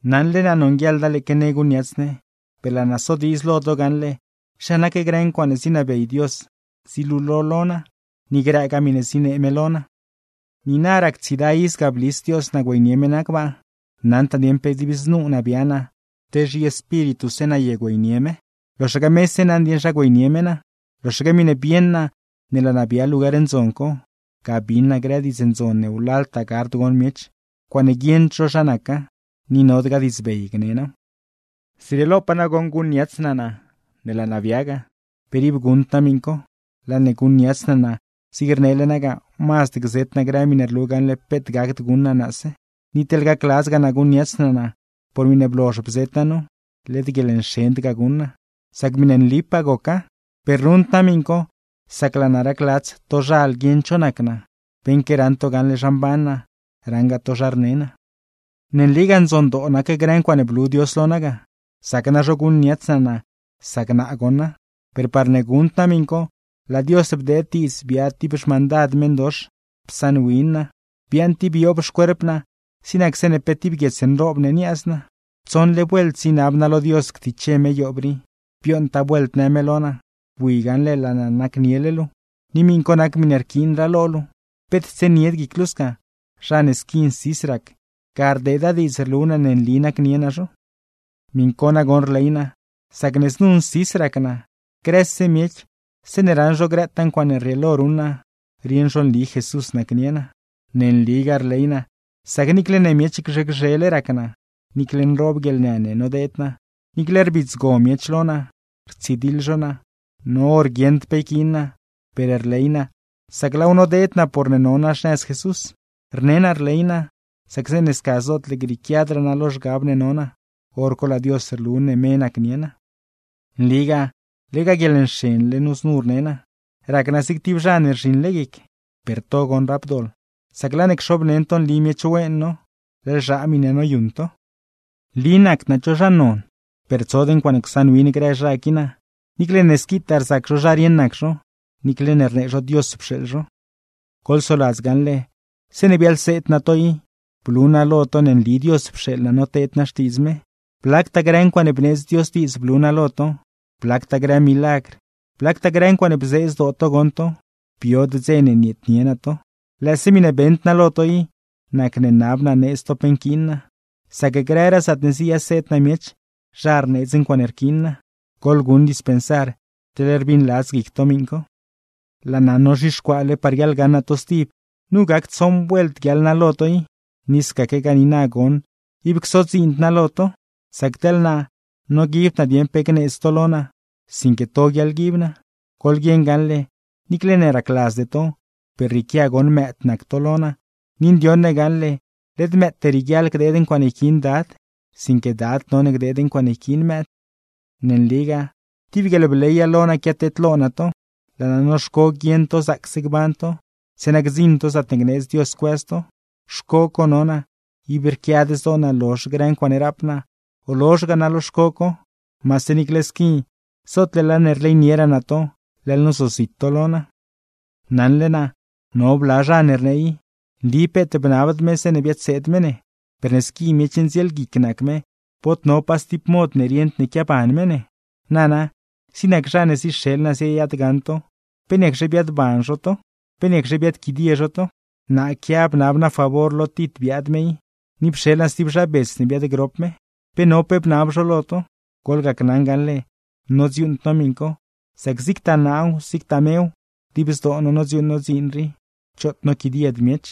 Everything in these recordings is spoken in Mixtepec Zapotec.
Naṉle naa nonguieḻda lëëque ne guṉniats ne, per laa naa sodiidz lo to gaṉle zha nac grë ncuaaṉe zinabey Dios zilulo lo naa, ni grëgaa miṉe zinee me lo naa. Niina rac tsiida iz ga blis Dios naa güeynie me naa gbaa. Naṉd naa dieṉ pe dib znu naa bia naa, te zhiespírituse naa ye güeynie me; loxaque mese naṉ dieṉ zha güeynie me naa. Loxaque miṉe bieṉ naa ne laa naa bia lugar ndzon co, ga bin naa grë diidz ndzon ne wlaltaa gard gon miech, ncuaaṉe guieṉd zho zha naca, ni nodgaa diidzbey gne naaw. Zrieelopaa nagoṉ guṉniats naa naa ne laa naa bia ga, per ib guṉd naa miṉ co. Laa ne guṉniats naa naa zig rnele naa ga, mazd gzet naa grë miṉe rlu gaṉle peet gacd guṉ naa naase. Ni teḻ gacladzgaa naa guṉniats naa naa por miṉe blozh bzet naa nu, led guieḻnxend ga guṉ naa; sac miṉe nlipaa goca. Per ruṉd naa miṉ co, sac laa naa racladz tozhal guieṉ cho nac naa, beṉque raṉ to gaṉle zha mban naa, raṉgaa to zha rne naa. Ne nligaa ndzondoo nac grë ncuaaṉe blu Dios lo naa ga, zac nazho guṉniats naa naa sac naa goṉa; per parne guṉd naa miṉ co, laa Dios bdeed diidz biaad tib xmandad meṉdox psaṉwin naa, biaaṉ tib yoob xcuerp naa zig nac zeeṉe pe tib guiets nroob ne niaaz naa. Tsoṉle vuelt zinab naa lo Dios ctiche me yoob rii; bioṉtaa vuelt në me lo naa: “Bui gaṉle laa naa nacniele luu, ni miṉ co nac miṉe rquiinraa lo luu. Peet tsienied guic luu sca, zha ne squi nsis rac, ga rdeeda diidz rlu naa ne nli naa nacnie zho.” Miṉ co nagoṉ rley naa, sac ne znu nsis rac naa, grëse miech zeeṉe raṉ zho grëtaa ncuaaṉe rrieelo ruṉ naa, rieṉ zho nli Jesús nacnie naa. Ne nligaa rley naa, sac niicle ne miech gzhe gzhele rac naa, niicle nroob guieḻnë ne nodeed naa, niicle rbidzgo miech lo naa, rtsidiḻ zho naa, no hor guieṉd pe yquiin naa, per rley naa sac laaw nodeed naa porne no naa xnëz Jesús. Rne naa rley naa, sac zeeṉe sca zootle grieequiadraa naa lo zhgab ne no naa, hor co laa Dios rlu ne me nacnie naa. ¡Nligaa lega guieḻnxenle nu znu rne naa, rac naa zig tib zha ne rzhiṉle guic! Per to goṉ rap doḻ, sac laa ne cxobneṉ to nli miech wen no, leḻ zhaa miṉe noyuṉ to. Nli nacd naa cho zha non, per tsod ncuaaṉe csaṉwin grë zha qui naa, niicle ne squitaa rzac zho zha rieṉ nac zho, niicle ne rnee zho Dios pxeeḻ zho. Goḻsoladz gaṉle, zeeṉe biaḻseed naa to i, blu naa lo to ne nli Dios pxeeḻ naa noteed naa Xtiidz me, blactaa grë ncuaaṉe bneedz Dios diidz blu naa lo to, blactaa grë milagr, blactaa grë ncuaaṉe bzee zdoo to goṉ to. Biod dze ne nieednie naa to. Lëëse miṉe beṉd naa lo to i, nacne nab naa needz to pe nquiin naa; sac grëraa zaatne ziyaseed naa miech, zha rneedz ncuaaṉe rquiin naa. ¡Goḻguṉ dispensar teḻne rbiṉladz guic to miṉ co! Laa naa nozhixcuaale par guiaḻgaṉ naa to stib. Nu gac tsoṉ vuelt guiaḻ naa lo to i; ni scaquegaa niina goṉ ib csodziind naa lo to. Sac teḻ naa, noguibd naa dieṉ pe gneedz to lo naa, sinque to guiaḻguib naa. Goḻguieṉ gaṉle, niicle ne racladzde to, per rrieequia goṉ mëëd nac to lo naa; ni ndioṉ ne gaṉle, led mëëte rieguiaḻ gdeed ncuaaṉe yquiin dad, sinque dad none gdeed ncuaaṉe yquiin mëëd. Ne nligaa, tib guieḻbleya lo naa quiateedlo naa to, laa naa noxco guieṉ to zaacse gban to, zeeṉa gdziṉ to zaatne gneedz Dios cuëz to. Xco co no naa, ib rquiad zdoo naa lozh grë ncuaaṉe rap naa, o lozhgaa naa lo xco co; maase niicle squi zootne laa ne rleynieraa naa to, leḻ nozozit to lo naa. Naṉle naa, no bla zha ne rnee i: “Nli peet bnabd me zeeṉe biadseed me ne, per ne squi miech ndzielguic nac me bod no pa stib mod ne rieṉd ne quiaban me ne.” Nana, zig nac zha ne zixeḻ naa ziyaadgaṉ to i, ¿pe niacxe biaadban zho to? ¿Pe niacxe biaadquidie zho to? Naa quia bnab naa favor lo Tit biaad me i, ni pxeḻ naa stib zha bets ne biaadgrop me. ¿Pe no pe bnab zho lo to? Goḻgacnaṉ gaṉle nodziuuṉd no miṉ co, sac zigtaa naaw, zigtagaa mew, dib zdoo no nodziuuṉ no dziin rii, choot noquidied miech.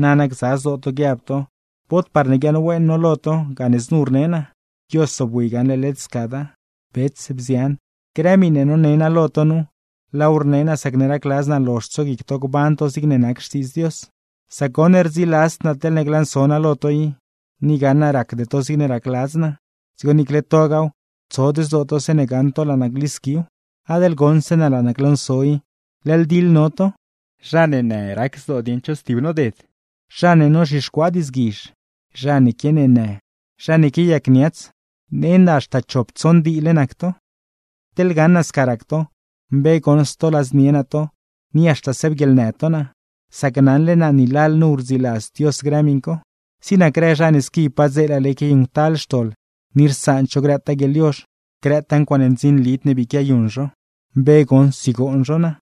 Nana gza zdoo to guiab to bod parne guiaaṉwen no lo to, gane znu rne naa. Dios zobwi gaṉle led scada. Bets, bzian, grë miṉe none naa lo to nu, laaw rne naa sacne racladz naa lozh tsoguic to gban to zigne nac Xtiidz Dios. Sac goṉ, rdziladzd naa teḻne glanso naa lo to i, ni gaṉ naa racde to zigne racladz naa; dzigo niicle togaaw, tsod zdoo to zeeṉe gaṉ to laa naa glisquiw. Adeḻ goṉ zeeṉe laa naa glanso i, leḻ diḻ no to; zha ne në rac zdoo dieṉ cho stib noded, zha ne nozhixcuaa diidzguizh, zha ne quianeenë, zha ne quiayacniats; nend haxta chop tsoṉ diile nac to. Teḻ gaṉ naa sca rac to, mbe goṉ stoladznie naa to ni haxta siaabguieḻnë to naa; sac naṉle naa ni lalnu rdziladzd Dios grë miṉ co. Zig nac grë zha ne squi padzeelale quiayuṉctal xtoḻ ni rsaand zho grëtaa guieḻyozh, grëtaa ncuaaṉe ndzinlid ne bii quiayuṉ zho, mbe goṉ sigoon zho naa.